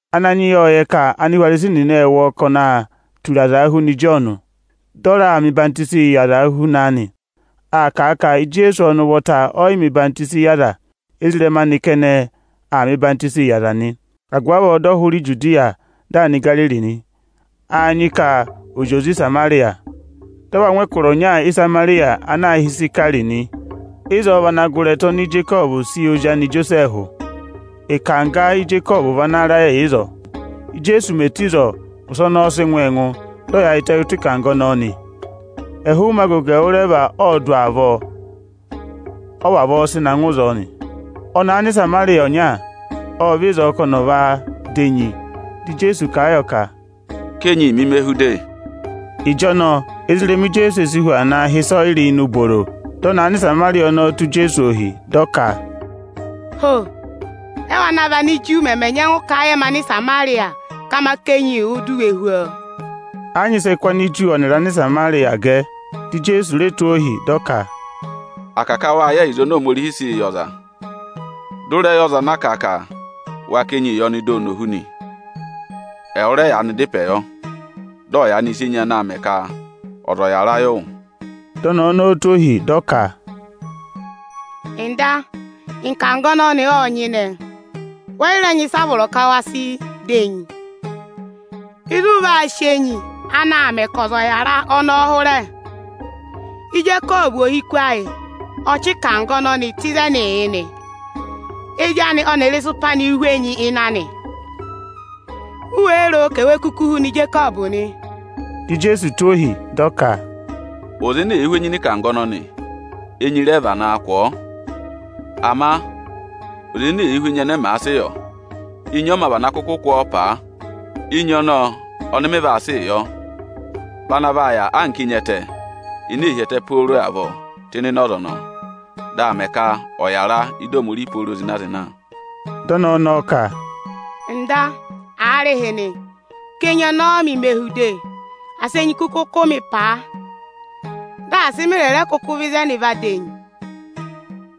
Ananyị yị ộ yẹ ka Anihwarisi nịnị ệ wụ́ ọọ ka ọnị ee tura azaa huna Ịjọọnụ, dị ọnị raa mẹ ọyịhwenyii yị azaa huna a nị. Àa ka à ka, Ijeesu ọnị ụvọta ọ yị mẹ̀ ọyịhwọzenyi yị aza; ezirẹma anị kẹnẹ aa mẹ ọyịhwenyii yị aza nị. Agụvị avọọ dị ọ hụrẹ Ijudiya dị aa nọ Igariri nị. Â nyị ka ò zị oze Ịsamarịya. Dị ọ va ngụ ẹkụra ọnya Ịsamarịya ana aā hị́ Ịsayịka nị. Ịzọọ vị ana gụrị ẹtẹ oni Ijekọvụ sị yị ozi anị Ijosẹẹhụ. Ịkangga Ijekọvụ vị ana rẹ yà ịzọọ. Íjeesu mè tù ịzọọ, ụsẹ ọnọọ ọ sị ngụ ọọ ẹngụ, dị ọ yaayịtẹ ụtọ ịkangga ọnọọ nị. Ẹhụụ ụmẹ agogo ẹwụrẹva ọọdụ avọọ, ọ vavọọ sị na ngụ ịzọọ nị. Ọnẹẹ Anịsamarịya ọnya aanị ộ vẹ ịzọọ ka ọnị ọ̀ va dà enyi. Dị Ijeesu kà a yọ ka, “Ká enyi mi, me hú de!” Ịjọnọọ, ezirẹma Ijeesu e si hu aa naa hị́ ịsọyịrị ini ubooro. Dị ọnẹẹ Anịsamarịya ọnọọ tụ́ Ijeesu ohi, dị ọ ka, “Ho! Ẹ́wụ ana vị Aniju mẹmẹ nyẹngụ kà a yị ẹmị Anịsamarịya ka ma ká enyi wụ di u we hú ọọ?” Ẹ yị nyị ịsị ẹẹ̄ kụ́ Aniju ọnịrị Anịsamarịyaa gẹ. Dị Ijeesu re tụ́ ọ ohi, dị ọ ka, “À kà ka wâ yẹ ẹyịza oni Ohomorihiī sịị yị ọza, dị ụ rẹ yẹ ọza ana kà ka wa ká enyi yị ọnị di oni ò hú nị, ẹwụ rẹ yaanị dá ịpẹ yọ, dị ọ yaanị sị enyi anaā mẹ ka ọza ọ̀ yàra yị wụ.” Dị ọnẹẹ ọnọọ tụ́ ohi, dị ọ ka, “Ọga, ịkangga ọnọnị ộ nyịnẹ, wẹ yị rẹ nyị ịsa ana a vọrọ ka wa sị dà enyi; ịzị ụ vaa sị enyi anaā mẹ ka ọza ọ̀ yàra ọnọọ hụrẹ? Ijekọvụ ohiku ayị ọ chị ịkangga ọnọnị tụ́ ịzẹnịị yị nị. Ezi anị ọnịrị ịsụpa anịị̄ hú enyi ịnị anị. U wéé ro ka ewee kuku huna Ijekọvụ nị?” Dị Ijeesu tụ́ ọ ohi, dị ọ ka, “Ọza ene èe hú enyi nị ịkangga ọnọnị, enyi rẹ vanaa kụ̀ ọọ. Ama ọza ene èe hú enyi ẹnẹ ẹmị àa sị yọ, enyi ọ mā vana kụkụ kụ̀ ọọ paa. Enyi ọnọọ ọnị mị vaa sịị yọ vị ana vaa yà anka enyi ẹtẹ ene ee hi ẹtẹ pooro avọọ tụ́ ịnịnẹ ọza ọnọọ; dị aa mẹ ka ọ̀ yàra ị́dị Ohomorihi pooro zịna-zịna.” Dị ọnẹẹ ọnọọ ka, “Ọga, aarịhịnị, ká enyi ọnọọ mị me hú de, dị ‘asị’ enyi kụkụ kụ̀ mị paa, dị asị mị rẹ̀ rẹ kụkụ vẹ ịzẹnị va dà enyi!”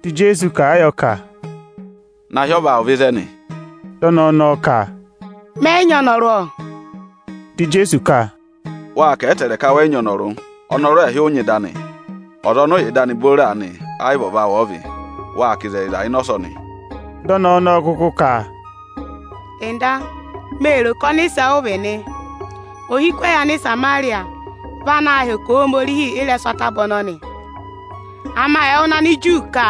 Dị Ijeesu kà a yọ ka, “Na hị́ ọva awụ vẹ ịzẹnị!” Dị ọnẹẹ ọnọọ ka, “Mẹ yị nyị ọnọrụ, ọ.” Dị Ijeesu ka, “Wâ kà a ẹtẹẹrẹ ka wẹ yị nyị ọnọrụ. Ọnọrụ ẹẹhị ụ va da nị. Ọza ọnị ụ yà ịdị anị booro aanị, ẹ yị vị ọva awụ ọ vị. Wâ kà ịzẹyịza ịnị ọsọnị.” Dị ọnẹẹ ọnọọ kụkụ ka, “Ọga, mee ro ka ọnịsẹ ụ vị nị. Ohiku ẹyị Anịsamarịya vị anaā hẹkẹ Ohomorihi ị́rẹsụ ataba ọnọnị. Ama ẹwụ nịnị Aniju ka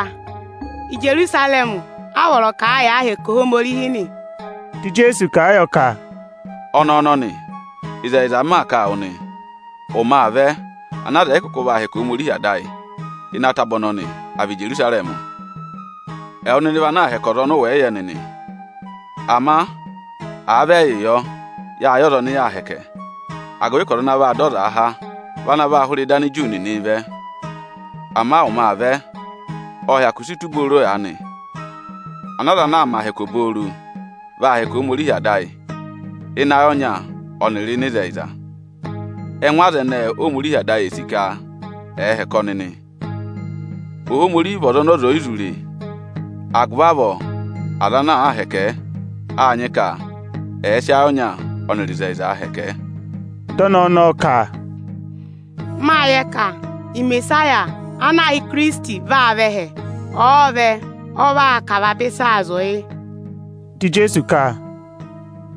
Ijerusarẹmị a vọrọ ka à yàa hẹkẹ Ohomorihi nị.” Dị Ijeesu kà a yọ ka, “Ọnẹẹ ọnọnị, ịzẹyịza m maa kà a wụ nị, ụmẹ aa vẹ ana aza ẹ̀ yị kụkụ vaa hẹkẹ Ohomorihi Ada ayị ịnị ataba ọnọnị, à vị Íjerusarẹmị. Ẹwụ nịnị vị ana aa hẹkẹ ọza ọnị ụ wẹ̀ yị yẹ nịnị; ama àa vị ẹyịị yọ, yâ yẹ ọza ọnị yaa hẹkẹ, agụvị ka ọza ana vaa dọ ọzaa há vị ana vaa hụrẹ ịdị Aniju nịnị ị vẹ. Ama ụmẹ aa vẹ, ộ hyakụ si tù booro aanị, ana aza ana aa mẹ ahẹkẹ obooro, vaa hẹkẹ Ohomorihi Ada ayị ịnị ayị ọnya ọnịrị ịnị ịzẹyịza. Ẹngụ aza ẹnẹẹ Óhomorihi Ada ayị sì ka ẹ̀ẹ hẹkẹ ọnị nị. Ohomorihi vị ọza ọnị ọza ò yi zụ re. Agụvị avọọ aza ana àa hẹkẹ ẹ, â nyị ka ẹ̀ẹ sị ayị ọnya ọnịrị ịzẹyịzaa hẹkẹ ẹ.” Dị ọnẹẹ ọnọọ ka, “Mâ yẹ ka Imesaya ana aā hị́ Ikirisiti vaa vẹ ẹhẹ. Ọ̀ọ vẹ, ọ vaa kà avaba ịsaa zụ̀ yị.” Dị Ijeesu ka,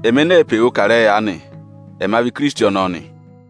“Ẹmị ene ee pe wuu kà ịrẹyị aanị, ẹma vị Ikirisiti ọnọọ nị.”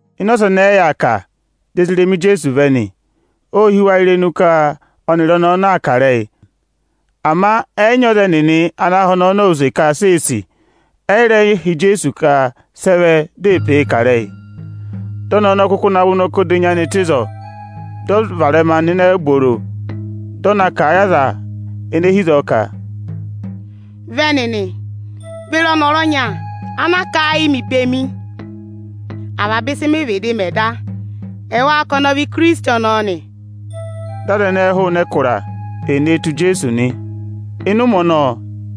Ịnị ọsọnị ẹ yà aa kà, di ezirẹma Ijeesu vẹ nị. Ô hí wa irenu ka ọnịrị ọnẹẹ aa kà ịrẹyị; ama ẹ yị nyị ọza ẹnịnị ana họ̀ ọnẹẹ ọnọọ use ka si ee sì, ẹ yị rẹ họ̀ Ijeesu ka sị ẹ vẹ di ee pee kà ịrẹyị. Dị ọnẹẹ ọnọọ kụkụ navọ ụnọkọ odenyi anị tụ́ ịzọọ, dị ọ varẹma nọ ini ubooro, dị ọ na kà a yị aza ene hi ịzọọ ka: “Vẹ nịnị, ve re ọnọrụ ọnya, ana kà a yị mị bemi, avaba ịsị mị vịdị mẹ da. Ẹwáá ka ọnị ọ vị Ikirisiti ọnọọ nị?” Dị aza ẹnẹẹ hụụnị ẹkụra, ee nee tù Ijeesu nị. Ịnị ụmẹ ọnọọ,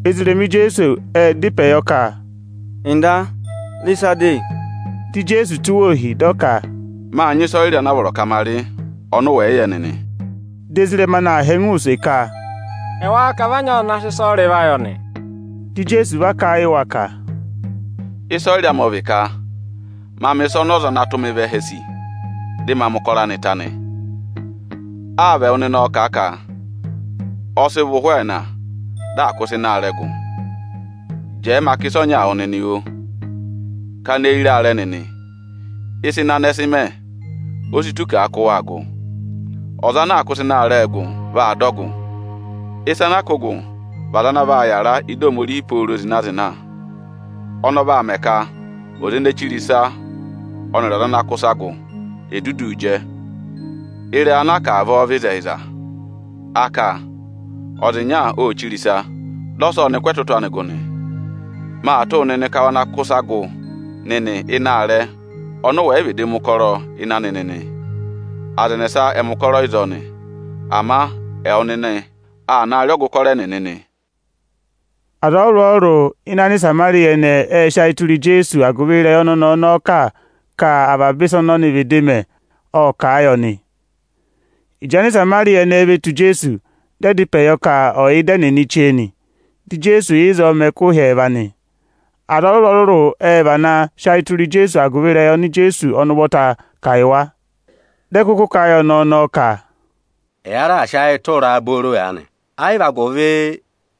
ezirẹma Ijeesu ệ dá ịpẹ yọ ka, “Ọga, rị ịsa de!” Dị Ijeesu tụ́ wa ohi, dị ọ ka, “Mâ nyị ịsọyịrị ana a vọrọ ka ma rị, ọnị ụ wẹ̀ yị yẹ nịnị.” Dị ezirẹma anị aa họ̀ ẹngụ use ka, “Ẹwáá ka vị a nyị ọza ana sị ịsọyịrị va yọ nị?” Dị Ijeesu va kà a yị wa ka, “Ịsọyịrị amị ọ vị ka ma mẹ̀ ịsa ọnị ọza ana tụ́ mị vẹ ẹhẹ sì, dị ma mẹ̀ ụkọrọ anị ta nị. Áa vị ẹwụ nịnị ọọ̄ kà a ka: ‘Ọ sị vọ ụhwẹ ẹẹna, dị à kụ́ ịsa ịnị aarẹ gụ?’ Jẹẹ ma kà ịsa ọnyaa wụ nịnị, oo! Kana eyi re aarẹ nịnị, ịsa ịnị anị ẹ sị mẹ, o si tù ka à kụ́ wa gụ. Ọza ana aa kụ́ ịsa ịnị aarẹ gụ, vaa dọ ọgụ, ịsa ana aa kụ́ụ gụ vị aza ana vaa yàra ị́dị Ohomorihi pooro zịna-zịna. Ọnọọ vaa mẹ ka ọza ene chire ịsa ọnịrị ọza ana kụ́ ịsa gụ è duduu jẹ. Ịrẹyị ana a kà avọọ vị ịzẹyịza, a ka: ‘Ọza ịnya ô chire ịsa, dị ọsa ọnị kụ́ ẹtụtụ anị gụ nị.’ Maa tụ́ wụ nịnị ka wa na kụ́ ịsa gụ nịnị ịnị aarẹ ọnị ụ wẹ̀ yị vịdị mẹ̀ ụkọrọ ịnị anị nịnị. Aza ẹnẹsa ẹ mẹ̀ ụkọrọ ịzọọ nị, ama ẹwụ nịnị aa naa rị ọgụ ụkọrọ ẹnịnị nị.” Aza ọrụrụ-ọrụrụ ịnị Anịsamarịya ẹnẹẹ ệ sị ayị tụra Ijeesu agụvị ịrẹyị ọnị ọnẹẹ ọnọọ kà ka, avaba ịsị ọnị vịdị mẹ da, ọ kà yị ọnị nị. Ịjị Anịsamarịya ẹnẹẹ ve tù Ijeesu, dị ẹ dá ịpẹ yọ ka ọ̀ yà ịda ẹnịnị chee nị. Dị Ijeesu yà ịzọọ mẹ ẹkụhị ẹẹva nị. Aza ọrụrụ-ọrụrụ ệ vana sị ayị tụra a agụvị ịrẹyị oni Ijeesu ọnị ụvọta kà yị wa. Dị ẹ kụkụ kà a yị ọnẹẹ ọnọọ ka, “Ẹ ya raà sị ayị tụra a booro aanị, ẹ yị vị agụvị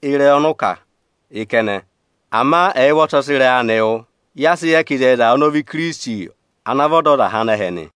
ịrẹyị ọnị ụ kà yị kẹnẹ; ama ẹyị ụvọta ọ sị ịrẹyị anị wụ́, ya sị yẹ ka ịzẹyịza, ọnị ọ vị Ikirisiti, ana vị Ọdọzaha anẹhẹ nị.”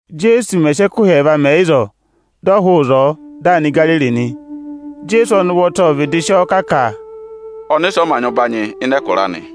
Íjeesu mẹ̀ sị ẹkụhị ẹẹva mẹ ịzọọ, dị ọ hụụ ịzọọ, dị aa nọ Igariri nị. Ijeesu ọnị ụvọta ộ vịdị sị ọọ kà ka, “Ọnịsẹ ọ mā nyị ụbanyị ịnị ẹkụra anị.”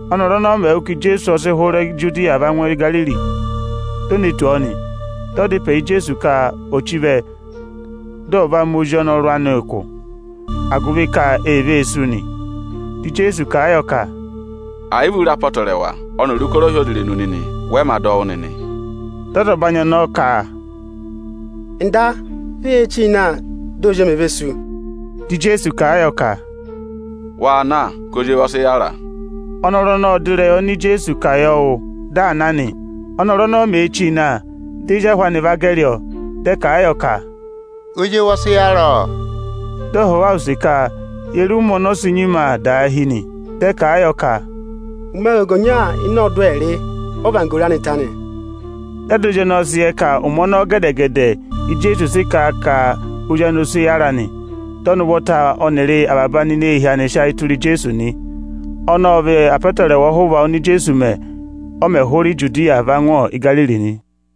Ọ́nọrụ ọnọọ mẹ̀ wụ́ ka Ijeesu ọ sị hụrẹ Ijudiya va ngụ Igariri, di o ne tù ọ nị. Dị ọ dá ịpẹ yị Ijeesu ka ò chí vẹ, dị ọ̀ va mẹ ozi ọnọrụ anị ụkụ, agụvị ka ee vee sú nị. Dị Ijeesu kà a yọ ka, “Ẹ̀ yị vị u re apọtẹrẹwa ọnịrị ụkọrọ ohyozirenu nịnị, wẹ mā dọ wụ́ nịnị.” Dị ọzọbanyị ọnọọ ka, “Ọga, vẹ ye chí na, di ozi emi ò ve sú de!” Dị Ijeesu kà a yọ ka, “Waa na, ka ozi ewu vaa daahi.” Ọnọrụ ọnọọ ộ dọ ịrẹyị oni Ijeesu kà yọ wụ́, dị aa na nị. Ọ́nọrụ ọnọọ mèe chíi na, di ezi ahụ anị va gẹrị ọọ, dị ẹ kà a yọ ka, “Ozi ewu ọ sị nyima aa daahi ọ!” Dị ọ họ̀ wa use ka, ye re ụmẹ oni o si nyima aa daahi nị? Dị ẹ kà a yọ ka, “Ụmẹ agogo ọnya ịnị ọọdụ ẹẹrị, ọ́vanggoro anị ta nị.” Dị ada ozi ọnọọ sị yẹ ka ụmẹ ọnọọ gẹdẹ-gẹdẹ Íjeesu sị kà a ka ozi anị vaa daahi nị. Dị ọnị ụvọta ọnịrị avaba aneehi anị sị ayị tụra Ijeesu nị. Ọnọọ ọ vị apọtẹrẹwa ọhụva oni Ijeesu mẹ, ọ mẹ̀ hụrẹ Ijudiya va ngụ Igariri nị.